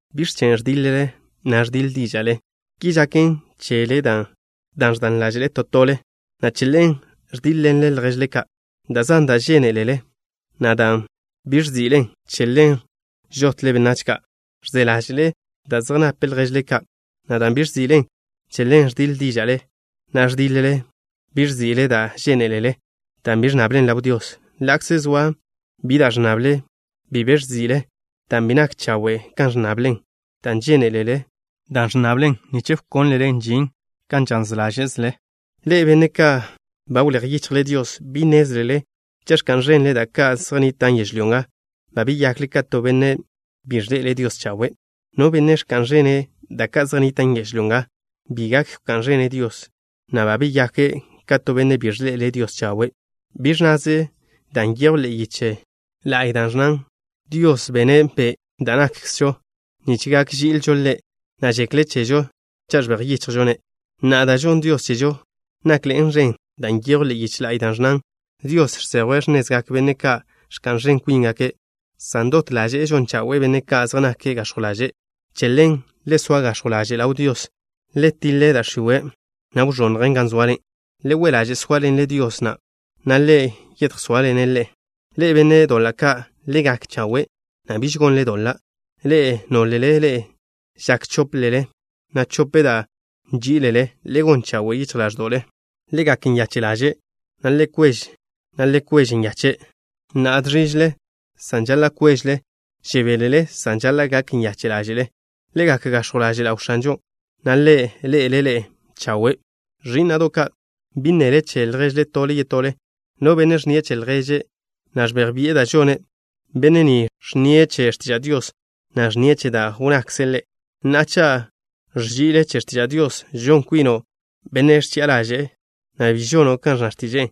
¿Biẕ chen' ẕdiḻ-le, na' ẕdiḻ díža'le? Ki žaken chele dan' ẕdan ḻáže'le da' zan da' ẕdan ḻáže'le to tole, na' che ḻen ẕdíḻ-ḻenle lježle ka'. Da' zan da' žénelele, na' dan' bi ẕzi'len, che ḻen žotle benách ka'. Ẕze ḻáže'le da' zej nap lježle ka', na' dan' bi ẕzi'len, che ḻen ẕdiḻ díža'le, na' ẕdiḻ-le. Bi ẕzi'le da' žénelele, dan' bi ẕnnablen ḻaw Dios. Ḻa'kze zoa bi da' ẕnnable, bi be ẕzi'le, dan' bi nak chawe' kan ẕnnablen, dan' žénelele da' ẕnnablen nich wkónlelen žin kan žaz ḻáže'zele. Ḻe'e, benne' ka' ba wléj yichjle Dios, ¿Bi nnézlele cha' ẕka'n ẕenle da' ka' zej nnitan' yežlyó nga, ba beyakle ka to benne' bi ẕḻe'ele' Dios chawe'? No benne' ẕka'n ẕene' da' ka' zej nnitan' yežlyó nga, bi gak wká'n ẕene' Dios, na' ba beyake' ka to benne' bi ẕḻe'ele' Dios chawe'. Bi ẕnnaze da' nyejw ḻe'e yiche la'y, da' ẕnnan: “Dios bene' be' da' nakkzžo nich gak ži'ilžo Ḻe', na' žekle' chežo cha' ẕbej yichjžo-ne'.” Na'a, da' žonn Dios chežo nakḻe'en ẕen, dan' nyejw ḻe'e yiche la'y, da' ẕnnan: “Dios žsejwe' x̱nezgak benne' ka' ẕka'n ẕen kwíngake', san dot ḻaže'e žon chawe'e benne' ka' zej nake' gax̱jw ḻaže'.” Che ḻen: Le soa gax̱jw ḻaže' ḻaw Dios. Le tiḻe da' x̱iwe', na' wẕonnjen gan zoale. Le we' ḻaže' sóaḻenle Dios, na' Ḻe' yedjsóaḻene' ḻe'e. Ḻe'e, benne' doḻa' ka', le gak chawe', na' biž gonle doḻa'. Ḻe'e, nólele ḻe'e žak chóplele, na' chope da' nží'ilele, le gon chawe' yichj ḻáẕdo'le. Le gak nyache' ḻaže', na' le kwež, na' le kwež nyache'. Na'a žẕížele san žaḻa' kwéžele. Žebélele san žaḻa' gak nyache' ḻáže'le. Le gak gax̱jw ḻaže' ḻaw X̱anžon', na' Ḻe' ḻe'ele' ḻe'e chawe'. Ẕí'na'do' ka', bi nnele che lježle tole yetole. No benne' ẕnnie' che lježe', na' ẕbej bi'e da' žone', benne' ni ẕnnie' che x̱tiža' Dios, na' ẕnnie' che da' wnnakze' Ḻe'. Na'a, cha' ẕži'le che x̱tiža' Dios, žon kwino' benne' ẕchi'a ḻaže'en, na' bi žono' kan ẕnna x̱tiže'e.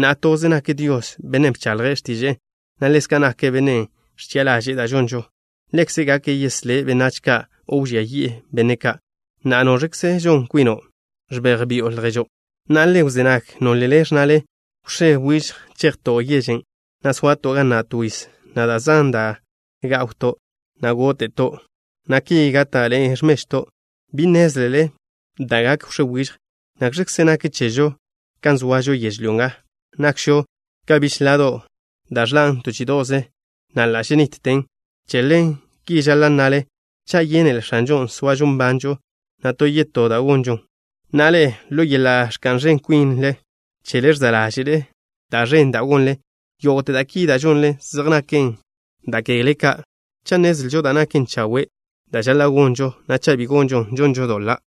Na'a, toze nak Dios, Bennen' bchaḻje' x̱tiže'e, na' ḻezka' nake' Bennen' ẕchi'a ḻaže'e da' žonžo. Ḻekze' gak yeslé' benách ka' o wžía yi'e benne' ka'. Na'a, ¿noẕkze žon kwino', ẕbej bi'o lježo'? Na'a, le wzé nag, nólele ẕnnale: “Wx̱é wižj chejto' yežen', na' soato' ga na' to yiz, na' da' zan da' gá'wto', na' góte'to', na' ki gáta'ḻe'e mežw cheto'.” Bi nnézlele da' gak wx̱é wižj. ¿Nakx̱kze nak chežo, kan zoažo yežlyó nga? Nakžo ka bichlá da' ẕḻan' to chí'ido'ze, na' ḻa' ženitten. Che ḻen, ki žaḻa' nnale: “Cha' yénele X̱anžon', soažo nbanžo, na' to yetó da' gonžon.” Na'a, ḻe'e, ḻo yeḻa' ẕka'n ẕen kwin chele ẕza' ḻáže'le da' ẕen da' gonle. Yógo'te da' ki da' žonlen zej naken da' kegle ka'. Cha' nnezlžo da' naken chawe' da' žaḻa' gonžon, na' cha' bi gonžon, žonžo doḻa'.